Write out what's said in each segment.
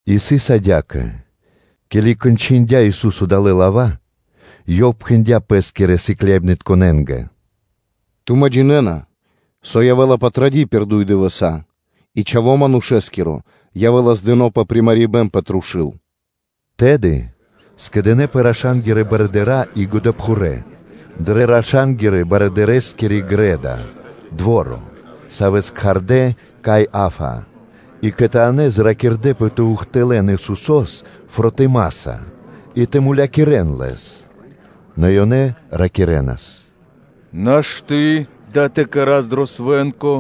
И сыс адя́кэ: ке́ли кончындя Ису́со далэ́ лава́, Ёв пхэндя́ Пэ́скирэ сыкляибнытконэ́нгэ: “Тумэ́ джинэ́на, со явэ́ла Патради́ пир дуй дывэса́ и Чхаво́ Манушэ́скиро явэ́ла здыно пэ примарибэн пэ трушу́л.” Тэды скэдынэ́пэ раша́нгирэ барыдыра́ и годэпхурэ́ дрэ раша́нгирэ барыдырэскири грэ́да (дво́ро), савэ́с кхардэ́ Каиа́фа, и кхэтанэ́ зракирдэпэ тэ ухтылэ́н Исусо́с фротымаса, и тэ мулякирэ́н Лэс; нэ ёнэ ракирэ́нас: “Нашты́ дава́ тэ кэра́с дро свэ́нко,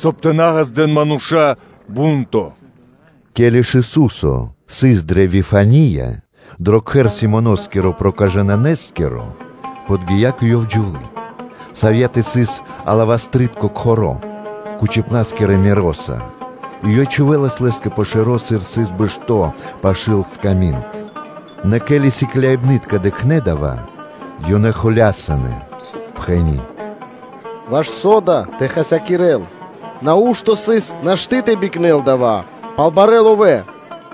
соб (кай) тэ на ґаздэ́н мануша́ шумо годлэнца.” Ке́ли ж Ису́со сыс дрэ Вифания дро кхэр Симоноскиро Проказытконэскиро, то подги́я кэ Ёв джувлы́, савьятэ сыс алавастрытко кхоро́ кучипнаскирэ миро́са и ёй чхувэлас Лэ́скэ пэ шэро́, сыр Ёв сыс бэшто́ пашы́л сками́нд. Нэ ке́ли сыкляибны́тка дыкхнэ́ дава́, ёнэ холясынэ, пхэни́: “Ваш со дава́ тэ хасякирэ́л? Нау́што сыс нашты́ тэ бикнэн дава́ пал барэ́ ловэ́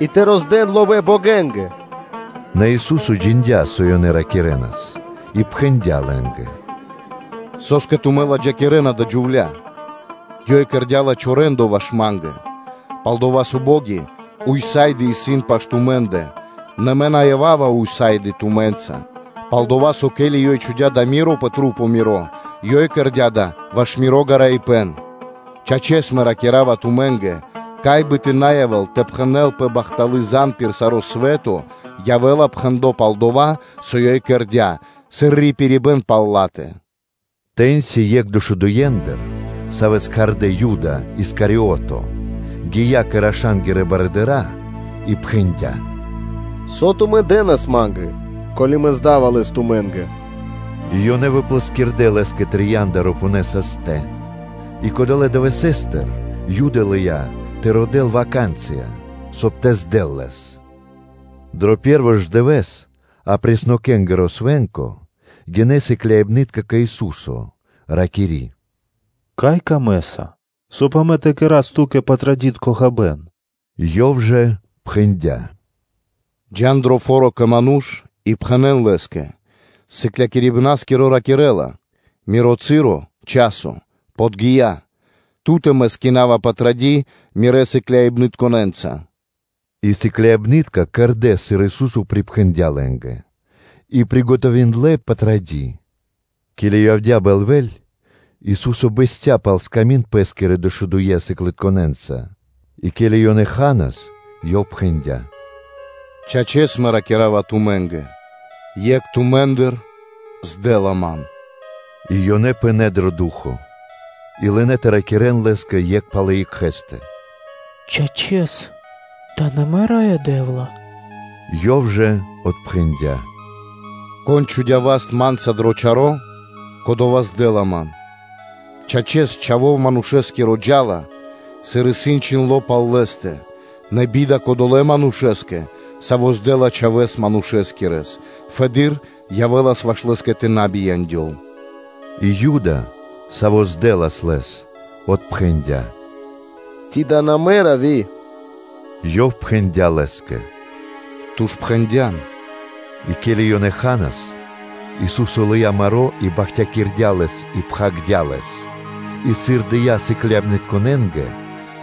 и тэ роздэн ловэ́ богэнгэ.” Нэ Ису́со джиндя́, со ёнэ ракирэ́нас, и пхэндя́ лэ́нгэ: “Со́скэ тумэ́ кэрэ́на пхаро́ адалэ́ джувля́кэ? Ёй кэрдя́ лачхо́ рэ́ндо (де́ло) ваш Ма́нгэ. Палдова́ со бо́ги ўса́ды (сак) исын пашы́л тумэ́ндэ, нэ Мэ на ява́ва ўса́ды (сак) тумэ́нца. Пал-дова́ со, ко́ли ёй чхудя́ дава́ миро пэ маса́ Мирэ́, ёй кэрдя́ дава́ ваш Миро гараибэн. Чачэс, Мэ ракира́ва тумэ́нгэ: кай бы тэ на явэ́л тэ пхэнэлпэ бахталы́ звесь пир саро́ свэ́то, явэ́ла пхэндло́ пал дова́, со ёй кэрдя́, сыр рипирибэ́н пал ла́тэ.” Тэ́ньци екх дэшудуендыр, савэ́с кхардэ́ Юда Искариото, гия́ кэ раша́нгирэ барыдыра́, и пхэндя́: “Со тумэ́ дэ́нас ма́нгэ, ко́ли мэ здава Лэс тумэ́нгэ?” И ёнэ выплэскирдэ лэ́скэ трия́нда рупунэ састэ. И кодолэ́ дывэсэ́стыр Юда лыя́ тэ родэ́л ваканцыя (случаё), соб (кай) тэ здэл Лэс. Дро пэ́рво ж дывэ́с апреснокэнгиро свэ́нко гинэ́ сыкляибны́тка кэ Ису́со, ракири́: “Кай Ту камэ́са, соб (кай) амэ тэ кэра́с Ту́кэ Патрадитко хабэ́н?” Ёв жа пхэндя́: “Джа́н дро фо́ро кэ ману́ш и пхэнэ́н лэ́скэ: ‘Сыклякирибна́скиро ракирэ́ла: Миро часо подги́я, Ту́тэ Мэ свэнкинава Патради́ Мирэ́ сыкляибнытконэ́нца.’” И сыкляибны́тка кэрдэ́, сыр Ису́со припхэндя́ лэ́нгэ, и кэрдэ́ Патради́. Ке́ли явдя́ бэльвэ́ль, Ису́со бэсця́ пал сками́нд Пэ́скирэ дэшудуе́ сыклябнытконэнца. И ке́ли ёнэ ханас, Ёв пхэндя́: “Чачэс, Мэ ракира́ва тумэ́нгэ: Екх тумэ́ндыр здэла Ман.” И ёнэ пынэ́ дро ду́хо (фа́но), и лынэ́ тэ ракирэ́н Лэ́скэ екх пал екхэ́стэ: “Чачэс, дава́ на мэ, Раё Дэ́вла?” Ёв жа отпхэндя́: “Кон чхудя́ васт Ма́нца дро чаро́, кодова́ здэла Ман. Чачэс, Чхаво́ Манушэ́скиро джа́ла, сыр исын чхиндло́ пал Лэ́стэ, нэ би́да кодолэ́ манушэ́скэ, саво́ здэла Чхавэ́с Манушэскирэс; фэды́р явэ́лас ваш лэ́скэ тэ на бияндёл.” И Юда, саво́ здэлас Лэс, отпхэндя́: “Ци дава́ на мэ, Равви?” Ёв пхэндя́ Лэ́скэ: “Ту ж пхэндя́н!” И ке́ли ёнэ ханас, Ису́со лыя́ маро́ и бахтякирдя́ лэс и роспхагирдя́ лэс и, сыр дыя́ сыкляибнытконэ́нгэ,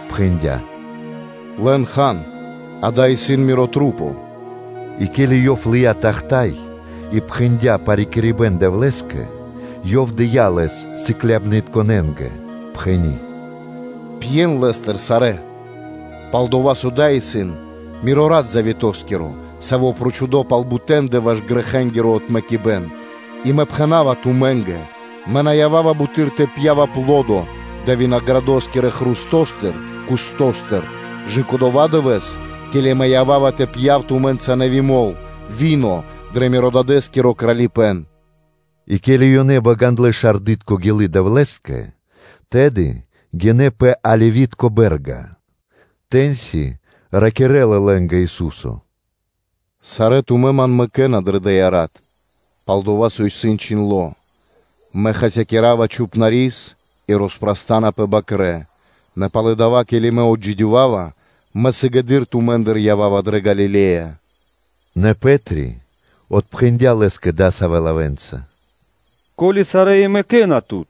пхэндя́: “Лэн, хан, дава́ исын Мирэ́ маса́.” И ке́ли Ёв лыя́ тахта́й (чаша) и пхэндя́ парикирибэн Дэвлэ́скэ, Ёв дыя́ Лэс сыкляибнытконэ́нгэ, пхэни́: “Пьен Лэ́стыр сарэ́. Пал-дова́ со дава́ исын Миро Рат завето́скиро, саво́ исын прочхудо пал бутэндэ ваш грэхэнгиро отмэкибэн. И Мэ пхэна́ва тумэ́нгэ: Мэ на ява́ва далэ́ дывэсэ́стыр буты́р тэ пья́в аплодо далэ́ винаградытконэ хрустостыр кэ/жы́ко дова́ дывэ́с, ке́ли Мэ ява́ва тэ пья́в тумэ́нца нэви́ мол (вино) дрэ Мирэ́-Дадэ́скиро Кралипэ́н’” И ке́ли ёны багандлэ шардытко гилы́ Дэвлэ́скэ, то тэды гинэ́ пэ Оливи́тко (Елеоноскири) бэ́рга. Тэ́ньци ракирэ́ла лэ́нгэ Ису́со: “Сарэ́ тумэ́ Ман мэкэ́на дрэ дая́ рат. Пал-дова́ со исын чхиндло́: ‘Мэ хасякира́ва Чхупнарис и роспрастанапэ бакрэ́;’ нэ пало́ дава́, ке́ли Мэ отджидёвава, Мэ сыгэды́р тумэ́ндыр ява́ва дрэ Галиле́я.” Нэ Пэ́три отпхэндя́ Лэ́скэ дасавэ́ лавэ́нца: “Ко́ли и сарэ́ тумэ́ мэкэ́на Тут,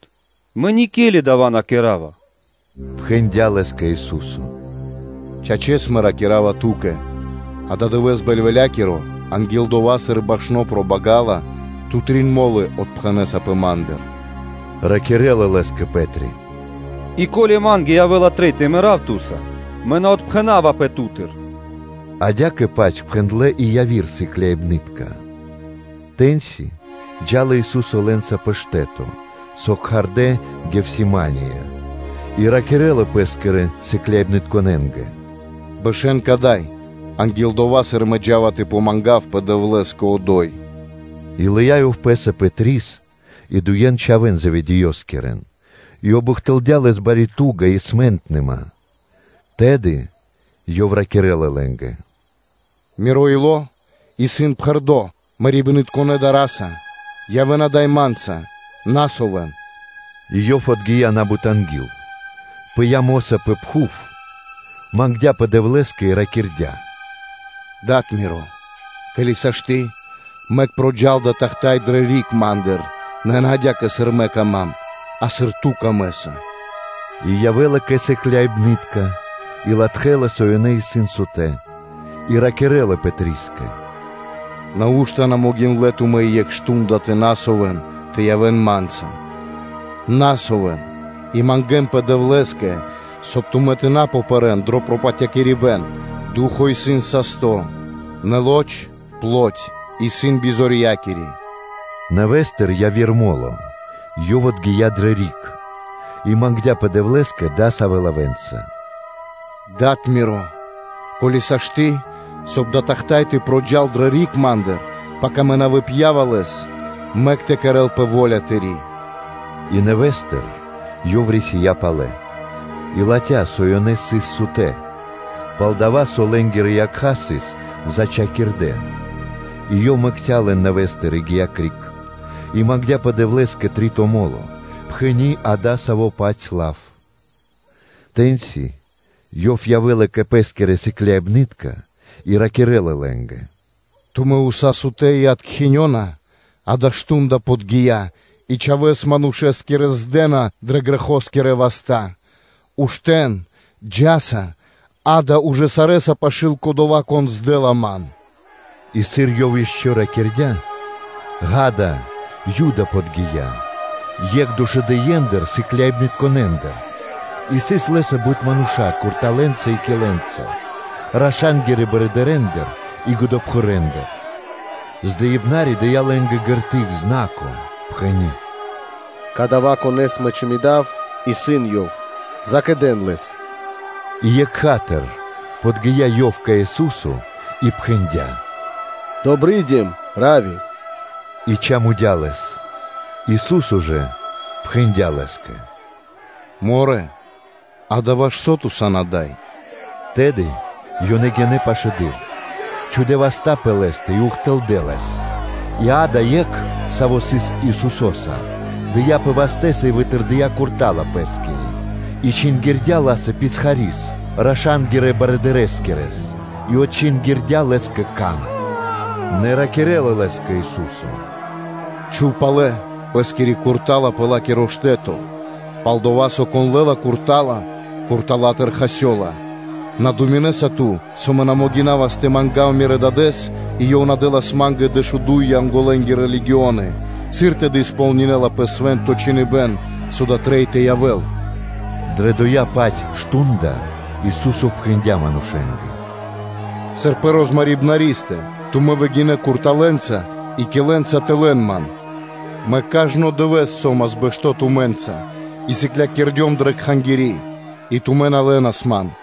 мэ никели дава́ на кэра́ва.” Пхэндя лэ́скэ Ису́со: “Чачэс, Мэ ракира́ва ту́кэ: ададывэ́с бэльвэлякиро, анги́л дова́, сыр башно пробагала, ту трин мо́лы отпхэнэсапэ Ма́ндыр.” Ракирэ́ла Лэ́скэ Пэ́три: “И ко́ли Ма́нгэ явэ́ла трэй тэ мэрав Ту́са, мэ на отпхэнавапэ Ту́тыр.” Адя́кэ-паць пхэндлэ́ и яви́р сыкляибны́тка. Тэ́ньци джа́лас Ису́со лэ́нца пэ штэ́то, со кхардэ́ Гефсимания, и ракирэ́лас Пэ́скирэ сыкляибнытконэ́нгэ: “Бэшэ́н кадай, анги́л дова́, сыр Мэ джа́ва тэ мангавпэ Дэвлэ́скэ одо́й.” И лыя́ Ёв Пэ́са Пэтрис и дуе́н чхавэ́н Заведеёскирэн, и обухтылдя Лэс бари ту́га и траш (дар). Тэды Ёв ракирэ́ла лэ́нгэ: “Миро ило́ исын пхэрдо́ мэрибнытконэ тугаса (скорбяса), явэ́н ада́й Ма́нца, на совэн.” И Ёв одгия на́бут анги́л, пыя́ мо́са пэ пхув, мангдя́пэ Дэвлэ́скэ и ракирдя́: “Да́до Ми́ро, ко́ли сашты́, мэк проджал дава́ тахта́й дрэ риг Ма́ндыр; нэ на адя́кэ, сыр Ма́нгэ трэй, а сыр Ту́кэ трэй.” И явэ́лас Ёв кэ сыкляибны́тка и латхэлас, со ёнэ сыс сутэ́, и ракирэ́лас Пэтрискэ: “Нау́што на могиндлэ́ тумэ́ и екх мардо́ (шту́нда) тэ ракхэ́нпэ, тэ явэ́н Ма́нца? Ракхэ́нпэ и мангэ́нпэ Дэвлэ́скэ, соб (кай) тумэ́ тэ на попэрэн дро пропатякирибэн; ду́хо (фа́но) исын састо́, нэ лоч (плоть) исын бизорьякири.” Нэвэ́стыр яви́р мо́ло, Ёв одгия дрэ риг и мангдя́пэ Дэвлэ́скэ дасавэ́ лавэ́нца: “Да́до Миро, ко́ли сашты́, соб (кай) дава́ тахта́й тэ проджал дрэ риг Ма́ндыр, пака Мэ на выпьява лэс, мэк тэ кэрэ́лпэ во́ля Тыри́!” И нэвэ́стыр Ёв рисия́ палэ и латхя́, со ёнэ сыс сутэ́, пал-дова́ со лэ́нгирэ якха́ сыс зачхакирдэ. И Ёв мэкця́ лэн нэвэ́стыр и гия́ криг, и мангдя́пэ Дэвлэ́скэ три́то мо́ло, пхэни́ дасаво-паць лав. Тэ́ньци Ёв явэ́лас кэ Пэ́скирэ сыкляибны́тка и ракирэ́лас лэ́нгэ: “Тумэ́ уса́ сан сутэ́ и откхинёна? Акэ, мардо́ (шту́нда) подги́я и Чхавэ́с Манушэскирэс здэна дрэ грэхэнгирэ васта́. Уштэ́н, джа́са, акэ, ужэ сарэ́са исын пашы́л кодова́, кон здэла Ман.” И сыр Ёв ишчо (инкэ́) ракирдя́, акэ, Юда подги́я, екх дэшудуендыр сыкляибнытконэндыр, и сыс лэ́са бут мануша́ курталэнца и килэнца, раша́нгирэ барыдырэндыр и годэпхурэндыр. Здыибнари дыя́ лэ́нгэ шпэ́ра (знако); пхэни́: “Кадава́, Конэ́с мэ чамудава, исын Ёв: закэдэн Лэс.” И екха́тыр подги́я ёв кэ Ису́со и пхэндя́: “Добридим, Равви!” И чамудя Лэс. Ису́со жэ пхэндя́ Лэ́скэ: “Морэ, акэ, ваш со ту сан ада́й!” Тэды ёнэ гинэ́ пашылэды́р, чхудэ́ васта́ пэ Лэ́стэ и ухтылдэ́ Лэс. И, акэ, екх, саво́ сыс Исусо́са, дыяпэ вастэ́са и вытырдыя курта́ла пэ́скири, и чингирдя ла́са писхари́с, раша́нгирэ барыдырэскирэс, и отчингирдя лэ́скэ кан. Нэ ракирэ́ла лэ́скэ Ису́со: “Чхув палэ пэ́скири курта́ла пэ ла́киро штэ́то; пал-дова́ со, кон лэ́ла курта́ла, куртала́тыр хасёла. На думинэса ту, со Мэ на могинавас тэ мангав Мирэс, Дадэ́с, и Ёв на дэ́лас Ма́нгэ дэшуду́й Янголэ́нгирэ легионы? Сыр тэды сполнинэласпэ Свэ́нто Чхиныбэ́н, со дава́ трэй тэ явэ́л?” Дрэ дова́-паць мардо́ (шту́нда) Ису́со пхэндя́ манушэ́нгэ: “Сыр пэ розмарибнаристэ тумэ́ выгинэ́ курталэнца и килэнца тэ лэн Ман? Мэ кажно дывэ́с со́мас бэшто́ тумэ́нца и сыклякирдём дрэ Кхангири́, и тумэ́ на лэнас Ман.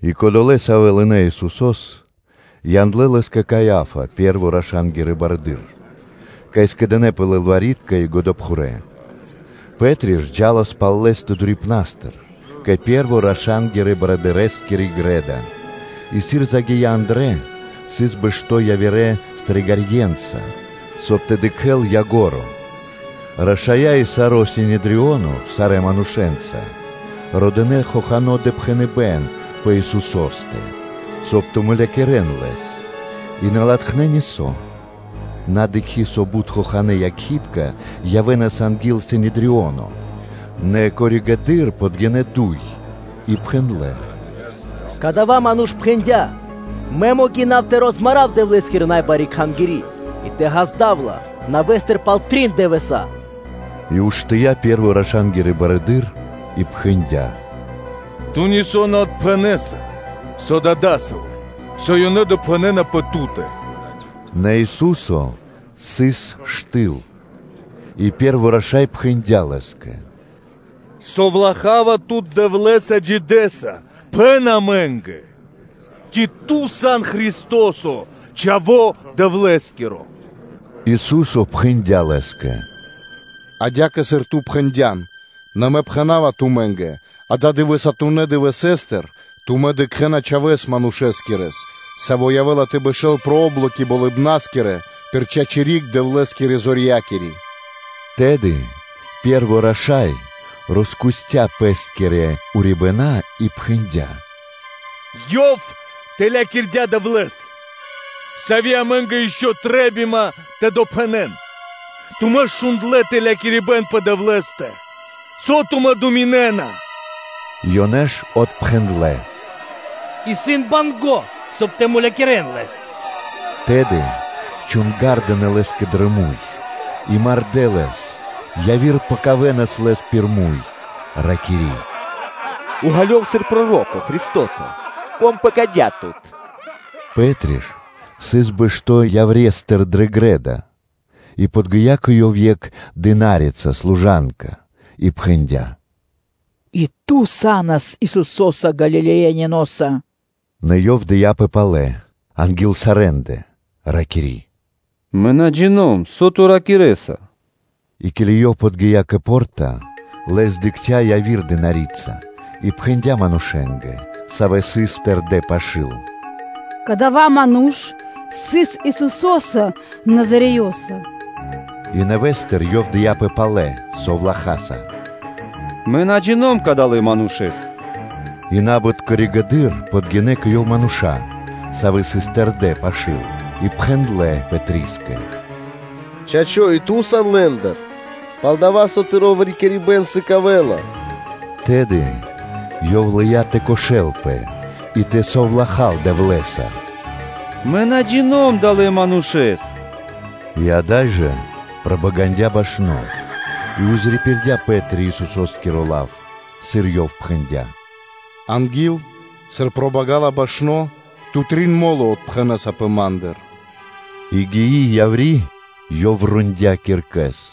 И кодолэ́, савэ́ лынэ́ Исусо́с, яндлэ́ Лэс кэ Каиа́фа, пэ́рво раша́нгиро барыдыро́, кай скэдынэ́пэ лылвари́тка и годэпхурэ́. Пэ́три ж джа́лас пал Лэ́стэ дурипнастыр кэ пэ́рво рашангирэскири грэ́да (дво́ро), и сыр загия́ андрэ́, сыс бэшто́ явирэ стрэгарьенца, соб (кай) тэ дыкхэ́л ко́нцо (яго́ро). Рашая́ и саро́ Синедрионо сарэ́ манушэ́нца родынэ хохано́ допхэныбэ́н пэ Исусо́стэ, соб (кай) тэ мулякирэ́н Лэс. И на латхнэ́ нисо́, на дыкхи́, со бут хоханэ́ якхи́тка (свидетели) явэ́нас анги́л Синедрионо. Нэ коригэды́р (позжэды́р) подгинэ́ дуй, и пхэндлэ́: “Кадава́ ману́ш пхэндя́: ‘Мэ могина́ва тэ роспхагирав Дэвлэ́скири най бари Кхангири́, и тэ ґаздав ла нэвэ́стыр пал трин дывэса́.’” И уштыя́ пэ́рво раша́нгиро барыдыро́ и пхэндя́: “Ту нисо́ на отпхэнэса? Со да дасаво исын, со ёнэ допхэнэна пэ Ту́тэ?” Нэ Ису́со сыс штыл. И пэ́рво раша́й пхэндя́ Лэ́скэ: “Засовлахава Тут Дэвлэ́са Джидэса: пхэн амэ́нгэ, ци Ту сан Христо́со, Чхаво́ Дэвлэ́скиро?” Ису́со пхэндя́ Лэ́скэ: “Адя́кэ, сыр Ту пхэндя́н; нэ Мэ пхэна́ва тумэ́нгэ: Ададывэсатунэ дывэсэ́стыр тумэ́ дыкхэ́на Чхавэ́с Манушэ́скирэ, Саво́ явэ́ла тэ бэшэ́л пэ о́блоки болыбна́скирэ пир чачи́ (право) риг Дэвлэ́скирэ Зорьякири.” Тэды пэ́рво раша́й роскусця пэ́скирэ урибэна́, и пхэндя́: “Ёв тэлякирдя Дэвлэ́с. Сави́ амэ́нгэ ишчо (инкэ́) трэ́бима тэ допхэнэн? Тумэ́ шундлэ́ ж тэлякирибэн пэ Дэвлэ́стэ. Со тумэ́ думинэ́на?” Ёнэ ж отпхэндлэ́: “Исын банго́, соб (кай) тэ мулякирэ́н Лэс.” Тэды чунгардынэ Лэ́скэ дро муй, и мардэ́ Лэс; яви́р пэкавэнас Лэс пир муй, ракири́: “Уґалёв сыр проро́ко, Христо́со, кон пэкадя́ Тут?” Пэ́три ж сыс бэшто́ яврестыр дрэ грэ́да, и подги́я кэ ёв екх дына́рица (служанка) и пхэндя́: “И ту са́нас Исусо́са Галилеяниноса.” Нэ ёв дыяпэ палэ анги́л сарэ́ндэ, ракири́: “Мэ на джино́м (на джина́в), со ту ракирэ́са.” И ке́ли ёв подги́я кэ по́рта, лэс дыкхця́ яви́р дына́рица, и пхэндя́ манушэ́нгэ, савэ́ сыс тэрдэ́ пашы́л: “Кадава́ ману́ш сыс Исусо́са Назареёса.” И нэвэ́стыр ёв дыяпэ палэ совлахаса: “Мэ на джино́м Кадалэ́ Манушэ́с.” И на́бут коригэды́р подгинэ́ кэ ёв мануша́, савэ́ сыс тэрдэ́ пашы́л, и пхэндлэ́ Пэтрискэ: “Чачо́, и ту сан лэ́ндыр, пал-дова́ со тыро́ выракирибэн сыкавэ́ла.” Тэды ёв лыя́ тэ прокошэл и тэ совлахал: “Мэ на джино́м (на джина́в) Кадалэ́ Манушэ́с” И ада́й жэ пробагандя башно. И пририпирдя Пэ́три Исусо́скиро лав; сыр Ёв пхэндя́: “Анги́л, сыр пробагала башно, ту трин мо́лы отпхэнэсапэ Ма́ндыр” И гии яври́, ёв рондя́ киркэс.